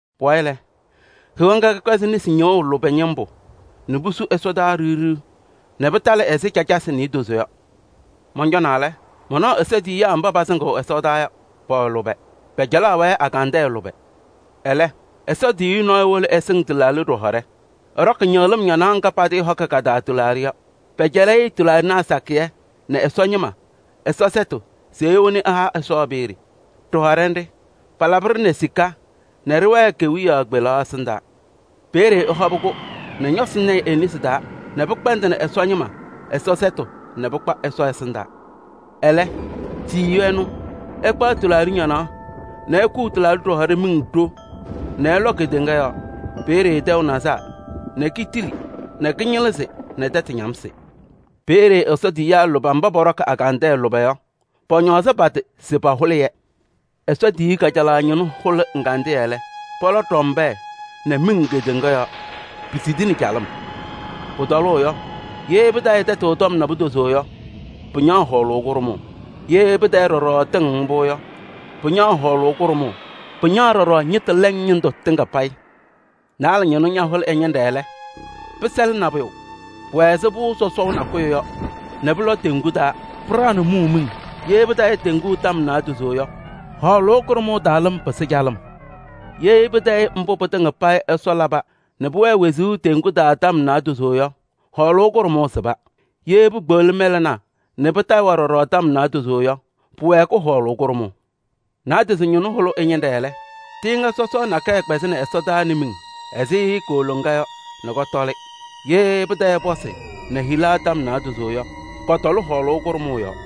Pʋwayɩ lɛ, Heɣa ŋga kɛkpɛzɩ nesi ñɩɣʋ lʋbɛ ñɩmbʋ nɛ pusu ɛsɔdaa ɖiɣ ɖiɣ nɛ pɩtalɩ ɛzɩ cacasɩ niidozo yɔ. Mɔncɔnaa lɛ, manaɣ Ɛsɔ tiyiyaa mba pasɩŋɩɣ ɛ-ɛsɩndaa yɔ, pɛwɛ lʋbɛ. Pɛcɛlaɣaɣ-wɛ agandɛɛ lʋbɛ. Ɛlɛ, Ɛsɔ tiyiyu nɔɔyʋ wolo ɛsɩŋ tɩlaaɖɩ ɖɩhɔɖɛ. Ɛɖɔkɩ ñɩɣlɩm ñanaɣ ŋga patɩɩhɔkɩ ka-taa tɩlaaɖɩ yɔ. Pɛcɛlɩ-ɩ tɩlaaɖɩnaa sakɩyɛ nɛ Ɛsɔ ñɩma Ɛsɔ sɛtʋ se ewoni ɛha Ɛsɔ peeye. Ɖɩhɔɖɛ nɖɩ, paalabɩ-ɖɩ nɛ sika nɛ ɖɩwɛɛ kewiyaɣ kpelaɣ ɛsɩndaa. Peeye ɛhɔbɩ-kʋ nɛ ñɔsɩ ñɛyɩ e-nesi taa nɛ pɩkpɛndɩnɩ Ɛsɔ ñɩma Ɛsɔ sɛtʋ nɛ pɩkpa Ɛsɔ ɛsɩndaa. Ɛlɛ tiyiyu ɛnʋ ɛkpaɣ tɩlaaɖɩ ñanaɣ nɛ ekuu tɩlaaɖɩ ɖɩhɔɖɛ miŋ ɖo nɛ ɛlɔ kedeŋa yɔɔ. Peeye tɛʋ nazaa nɛ kitili nɛ kɩñɩlɩzɩ nɛ tɛtʋ ñamsɩ. Peeye Ɛsɔ tiyiyaa lʋbɛ mba pɔɖɔkɩ agandɛɛ lʋbɛ yɔ, pɔñɔɔzɩ pa-tɩ se pahʋlɩ-yɛ. Ɛsɔ tiyiyu kajalaɣ ñɩnʋ hʋlɩ ɛgandɩyɛ lɛ, pɔlɔ ɖɔmbɛɛ nɛ miŋ kedeŋa yɔɔ, pisidini calɩm. Pʋtɔlʋʋ yɔ, ye pɩtayɩ tɛtʋ tɔm naadozo yɔ, pɩñaɣ hɔɔlʋʋ kʋɖʋmʋʋ. Ye pɩtayɩ ɖɔɖɔ tɩŋ mbʋ yɔ, pɩñaɣ hɔɔlʋʋ kʋɖʋmʋʋ, pɩñaɣ ɖɔɖɔ ñɩtʋ lɛŋ ñɩndʋ tɩŋa payɩ. Naalɛ ñɩnʋ ñahʋlɩ ɛ-ñɩnɖɛ lɛ, pɩsɛlɩ nabʋyʋ, pʋwɛ ɛzɩ pʋʋ sɔsɔɔ nakʋyʋ yɔ nɛ pʋlɔ teŋgu taa, pɩɖaɣnɩ mʋʋ miŋ. Ye pɩtayɩ teŋgu tɔm naadozo yɔ, hɔɔlʋʋ kʋɖʋmʋʋ taa lɩm pɩsɩ calɩm. Ye pɩtayɩ mbʋ pɩtɩŋa payɩ Ɛsɔ laba nɛ pʋwɛɛ wezuu teŋgu taa yɔ tɔm naadozo yɔ, hɔɔlʋʋ kʋɖʋmʋʋ sɩba. Ye pekpeɣli mɛlɛnaa nɛ pɩtayɩ-wɛ ɖɔɖɔ tɔm naadozo yɔ, pʋwɛɛkɩ hɔɔlʋʋ kʋɖʋmʋʋ. Naadozo ñɩnʋ hʋlɩ ɛ-ñɩnɖɛ lɛ, tɩɩŋa sɔsɔɔ nakɛyɛ kpɛzɩnɩ ɛsɔdaa nɛ miŋ ɛzɩ kooloŋa yɔ nɛ kɔtɔlɩ. Ye pɩtayɩ pɔsɩ nɛ hila tɔm naadozo yɔ, kɔtɔlɩ hɔɔlʋʋ kʋɖʋmʋʋ yɔɔ.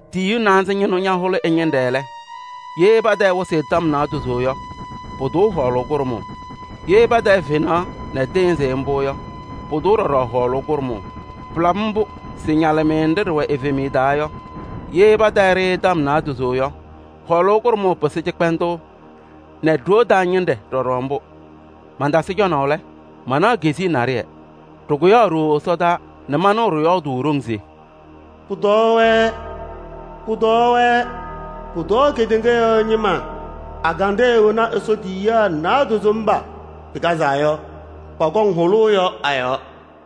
Tiyiyu naanza ñɩnʋ ñahʋlɩ ɛ-ñɩnɖɛ lɛ, ye pɩtayɩ wɩsɩ tɔm naadozo yɔ, pʋtʋʋ hɔɔlʋʋ kʋɖʋmʋʋ. Ye pɩtayɩ fenaɣ nɛ tɩɩnzɩ mbʋ yɔ, pʋtʋʋ ɖɔɖɔ hɔɔlʋʋ kʋɖʋmʋʋ. Pɩlabɩ mbʋ se ñalɩmɩyɛ nɖɩ ɖɩwɛ evemiye taa yɔ, ye pɩtayɩ-ɖɩ tɔm naadozo yɔ, hɔɔlʋʋ kʋɖʋmʋʋ pɩsɩ cɩkpɛndʋʋ nɛ ɖoo taa ñɩnɖɛ ɖɔɖɔ mbʋ. Mantasɩ cɔnaʋ lɛ, manaɣ keziye naɖɩyɛ, ɖɩkʋyaɣ ɖooo ɛsɔdaa nɛ manɩɣ ɖɩyɔɔdʋʋ ɖoŋ se: “Pʋtɔɔ-wɛ! Pʋtɔɔ-wɛ! Pʋtɔɔ kedeŋa yɔɔ ñɩma, agandɛɛ wena Ɛsɔ tiyiyaa naadozo mba pɩkazaa yɔ, pɔkɔŋ hʋlʋʋ yɔ a-yɔɔ!”